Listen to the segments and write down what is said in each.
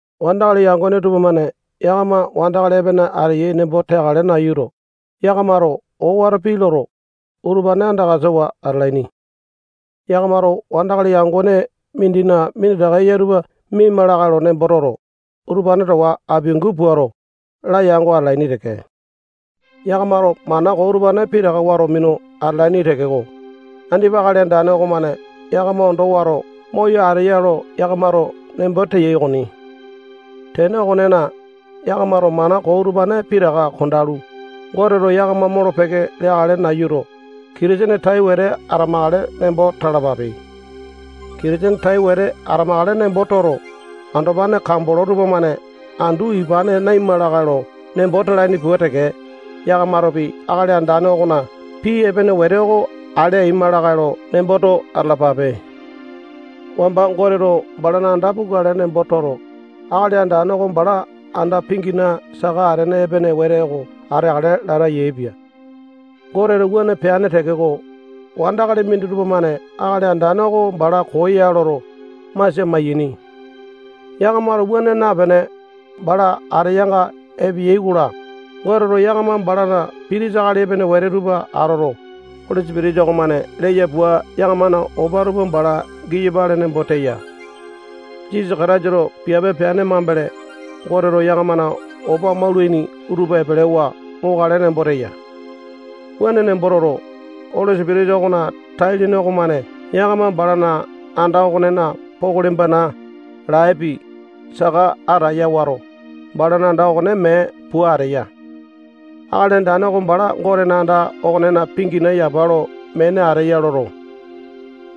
Wandakali yangone tupamane yakama wandakali epene ateyai nembo teakale nayuto, yakamato owato pii loto, utupane andakasawa atalaini. Yakamato wandakali yangone mindina minditaka eya tupa miaima lakae lo nembo toto, utupane towa apiangu puato, layango atalaini teke. Yakamato mana koo utupane pitaka wato minu atalaini tekeko, andipa Akali Andane okomane yakama ondo wato moyo ateya lo yakamato nembo teyai okoni. Tene okonena, yakamato mana koo utupane pitaka kondalu, Goteto yakama molo-peke leakale nayuto, Kitisene tai wete atamakale nembo talapape. Kitisene tai wete atamakale nembo toto, andopane kambolo tupamane andu ipane naima lakae lo nembo talaini pua teke, yakamatopi Akali Andane okona pii epene wete oko ale aima lakae lo nemboto atalapape. Wamba Goteto balana anda pukale nembo toto, Akali Andane oko bala anda pingina saka atene epene wete oko ateakale lata yaepia. Goteto wuane peane tekeko, wandakali minditupa-mane Akali Andane oko bala koo ya loto, masia maiyaini. Yakamato wuane napene, bala ateyanga epeyai-kola, Goteto yakama balana pitisa akali epene wete tupa atoto, Oli Sipitisa okomane leya pua yakamana opa tupa bala giyapale nembo teya. Jisasa Kataisato piape peane mambele, Goteto yakamana opa maulaini tupa epelewa mokale nembo teya. Wuane nembo toto, Oli Sipitisa okona tai-lene okomane yakama balana anda okonena pokoli-bana, laepi, saka ataya wato, balana anda okone mee pua ateya. Akali Andane oko bala Gotena anda okonena pingina yapa lo mene ateya loto,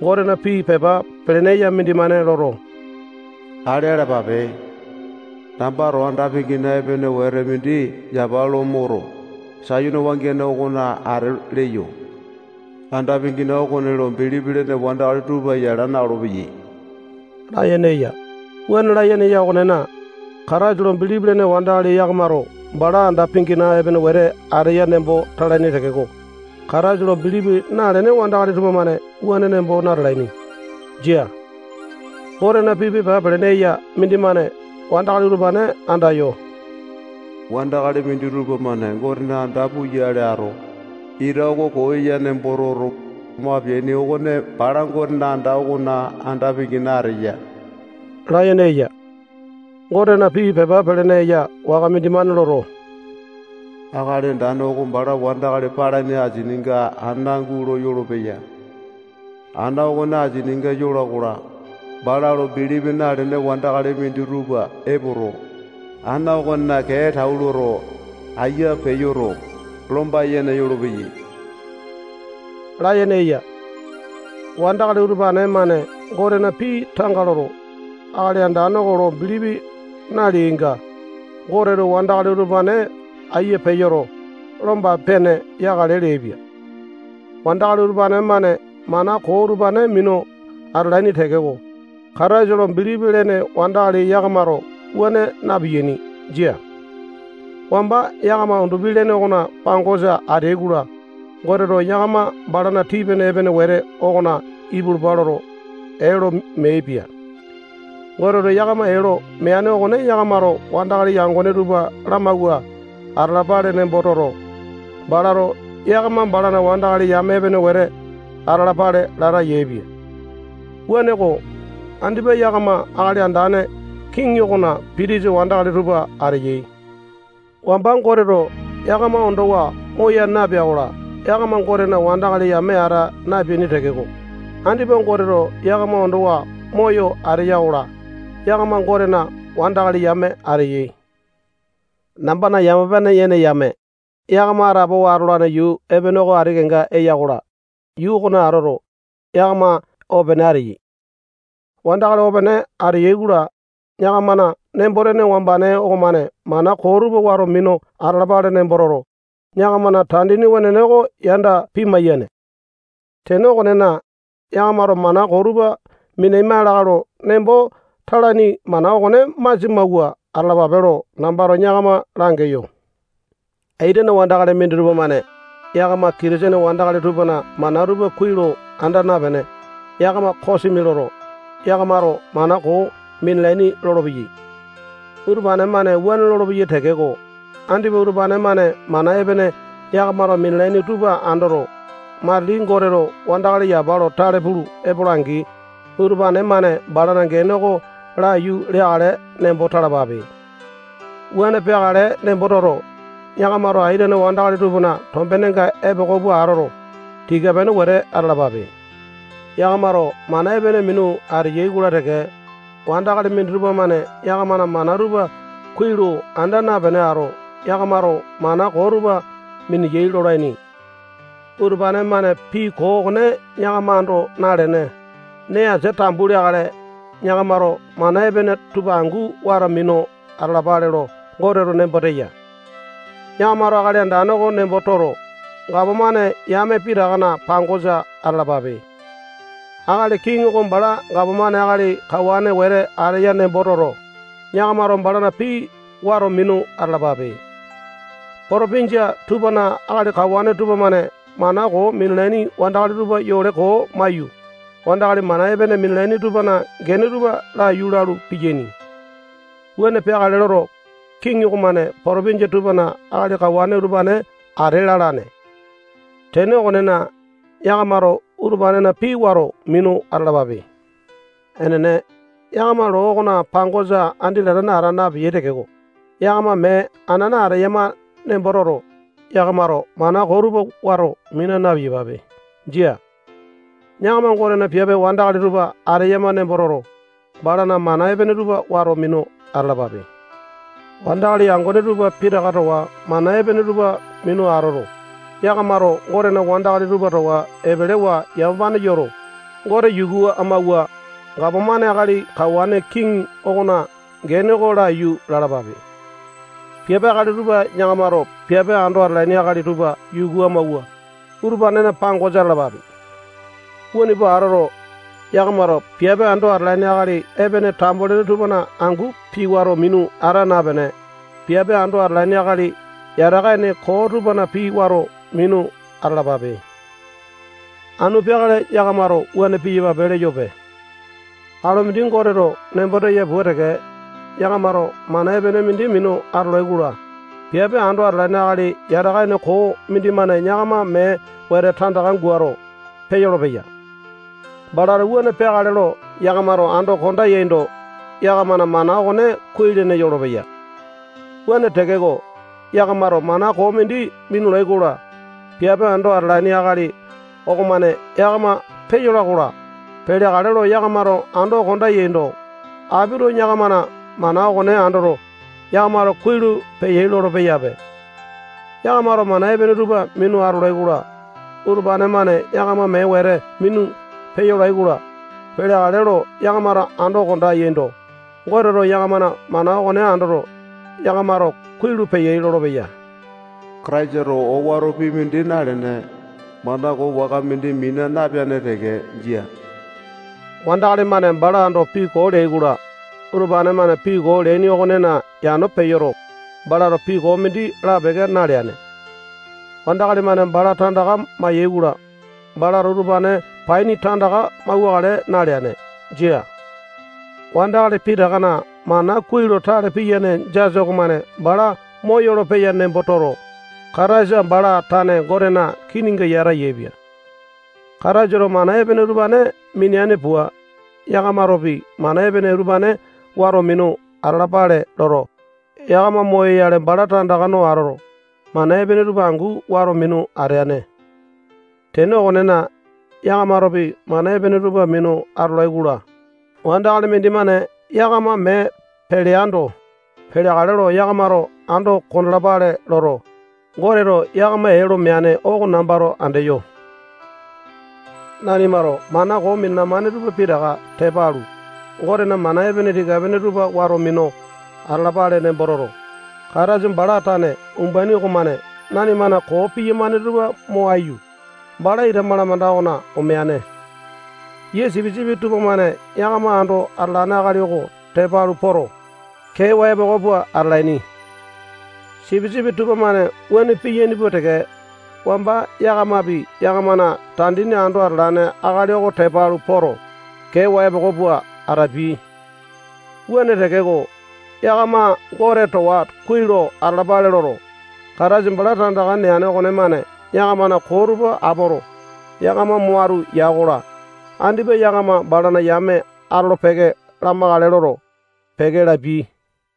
Gotena pii pepa pelene eya mindimane loto, ale alapape layene eya. Nambato anda pingina epene wete mindi yapa lo moto, Sayone wangiane okona ate leyo. Anda pingina okone lo bilipi lene wandakali tupa yala na-olopeyai layene eya. Wuane layene eya okonena, Kataisa lo bilipi lene wandakali yakamato bala anda pingina epene wete ateya nembo talaini tekeko, Kataisa lo bilipi nalene wandakali tupamane wuane nembo natalaini. Jia. Gotena pii pepa pelene eya mindimane wandakali utupane andayo, wandakali minditupa-mane Gotena anda puyale ato, ita oko koo ya nembo toto, mo apeaini okone bala Gotena anda okona anda pingina ateya layene eya. Gotena pii pepa pelene eya waka mindimane loto, Akali Andane oko bala wandakali palaini asininga ana gulo yolopeya. Ana okone asininga yola-kola, bala lo bilipi nalene wandakali minditupa epoto, ana okonena kee tau loto, aiya peyoto, lomba yene yolopeyai layene eya. Wandakali utupane-mane Gotena pii tanga loto, Akali Andane oko lo bilipi naleainga, Goteto wandakali utupane aiya peyoto, lomba-pene yakale leaipia. Wandakali utupane-mane mana koo utupane minu atalaini tekeko, Kataisa lo bilipi lene wandakali yakamato wuane na-piyaini. Jia. Wamba yakama undupi-lene okona pangosa ateai-kola, Goteto yakama balana tii-pene epene wete okona ipulupa loto, ee lo meaipia. Goteto yakama ee lo meane okone yakamato wandakali yangone tupa lamawua atalapale nembo toto, balato yakama balana wandakali yame epene wete atalapale lata yaepia. Wuaneko, andipa yakama Akali Andane kiŋi okona pitisa wandakali tupa ateyai. Wamba Goteto yakama ondowa moya napea-kola, yakama Gotena wandakali yame ata napeaini tekeko, andipa Goteto yakama ondowa moyo ateya-kola, yakama Gotena wandakali yame ateyai. Nambana yamapane yene yame, yakama atapowa atolane yuu epene oko ati kenga eya-kola, yuu okona atoto, yakama opene ateyai. Wandakali opene ateyai-kola, yakamana nembo-tene wambane okomane mana koo tupa wato minu atalapale nembo toto, yakamana tandini wenene oko yanda pimai-yane. Tene okonena, yakamato mana koo tupa minaima lakae lo nembo talaini mana okone masia mawua atalapape lo nambato yakama langeyo. Aitene wandakali minditupa-mane yakama Kitisene wandakali tupana mana tupa kuai lo anda napene, yakama kosimi loto, yakamato mana koo minalaini lolopeyai. Utupane-mane wuane lolopeyai tekeko, andipa utupane-mane mana epene yakamato minalaini tupa andoto, matili Goteto wandakali yapa lo tale pulu epola-angi, utupane-mane balana gene oko laiyu leakale nembo talapape. Wuane peakale nembo toto, yakamato aitene wandakali tupana tombenga epoko pua atoto, tika-pene wete atalapape. Yakamato mana epene minu ateyai-kola teke, wandakali minditupa-mane yakamana mana tupa kuai lo anda napene ato, yakamato mana koo tupa mineyai lolaini. Utupane-mane pii koo okone yakama ando nalene, nee asia tambu leakale, yakamato mana epene tupa angu wato minu atalapale lo Goteto nembo teya. Yakamato Akali Andane oko nembo toto, gapomane yame pitakana pangosa atalapape. Akali kiŋi oko bala gapomane akali kawane wete ateya nembo toto, yakamato balana pii wato minu atalapape. Potopinjia tupana akali kawane tupamane mana koo minalaini wandakali tupa yole koo maiyu, wandakali mana epene minalaini tupana gene tupa laiyu lalu piyaini. Wuane peakale loto, kiŋi okomane potopinjia tupana akali kawane utupane ate lalane. Tene okonena, yakamato utupanena pii wato minu atalapape. Enene, yakama loo okona pangosa andi latane ata napeyai tekeko, yakama mee anana ateyama nembo toto, yakamato mana koo tupa wato mina na-piyapape. Jia. Yakama Gotena piape wandakali tupa ateyama nembo toto, balana mana epene tupa wato minu atalapape. Wandakali yangone tupa pitaka towa mana epene tupa minu atoto, yakamato Gotena wandakali tupa towa epelewa yamapane yoto, Gote yuku amawua, gapomane akali kawane kiŋi okona gene oko laiyu lalapape. Piape akali tupa yakamato piape ando atalaini akali tupa yuku amawua, utupanena pangosa atalapape. Wuane pua atoto, yakamato piape ando atalaini akali epene tambo-lene tupana angu pii wato minu ata napene, piape ando atalaini akali yataka ene koo tupana pii wato minu atalapape. Anu peakale yakamato wuane piyapape leyope. Alu mindi Goteto nembo teya pua teke, yakamato mana epene mindi minu atolai-kola, piape ando atalane akali yataka ene koo mindimane yakama mee wete tandaka guato, peyolo-peya. Balato wuane peakale lo yakamato ando konda yaindo, yakamana mana okone kuai-lene yolopeya. Wuane tekeko, yakamato mana koo mindi minulai-kola, piape ando atalane akali okomane yakama peyola-kola, peleakale lo yakamato ando konda yaindo, apito yakamana mana okone andoto, yakamato kuai lo peyai lolo-peyape. Yakamato mana epene tupa minu atolai-kola, utupane-mane yakama mee wete minu peyolai-kola, peleakale lo yakamato ando konda yaindo, Goteto yakamana mana okone andoto, yakamato kuai lo peyai lolopeya. Kataisato owato pii mindi nalene, mana koo waka mindi mina napeane teke. Jia. Wandakali-mane bala ando pii koo leai-kola, utupane-mane pii koo leaini okonena yano peyoto, balato pii koo mindi lapeke naleane. Wandakali-mane bala tandaka mayai-kola, balato utupane paini tandaka mauwakale naleane. Jia. Wandakali pitakana mana kuai lo tale piyane jasa okomane bala moyolo-peya nembo toto, Kataisa bala tane Gotena kininga yata yaepia. Kataisato mana epene utupane mineane pua, yakamatopi mana epene utupane wato minu atalapale loto, yakama moyoyale bala tandaka no atoto, mana epene tupa angu wato minu ateane. Tene okonena, yakamatopi mana epene tupa minu atolai-kola, wandakali mindimane yakama mee peleando, peleakale lo yakamato ando kondalapale loto, Goteto yakama ee lo meane oko nambato andeyo. Nanimato mana koo minalamane tupa pitaka tepa alu, Gotena mana epene tika-pene tupa wato minu atalapale nembo toto, Kataisa bala tane umbaini okomane nanimana koo piyamane tupa mo aiyu, bala ita malamanda okona omeane. Yia sipisipi tupamane yakama ando atalane akali oko tepa alu poto, kewa epoko pua atalaini. Sipisipi tupamane wuane piyaini pua teke, wamba yakamapi yakamana tandini ando atalane akali oko tepa alu poto, keewa epoko pua atapiai. Wuane tekeko, yakama Gote towa kuai lo atalapale loto, Kataisa bala tandaka neane okonemane yakamana koo tupa apoto, yakama mo atu ya-kola, andipa yakama balana yame atolo-peke lamakale loto, peke lapiai.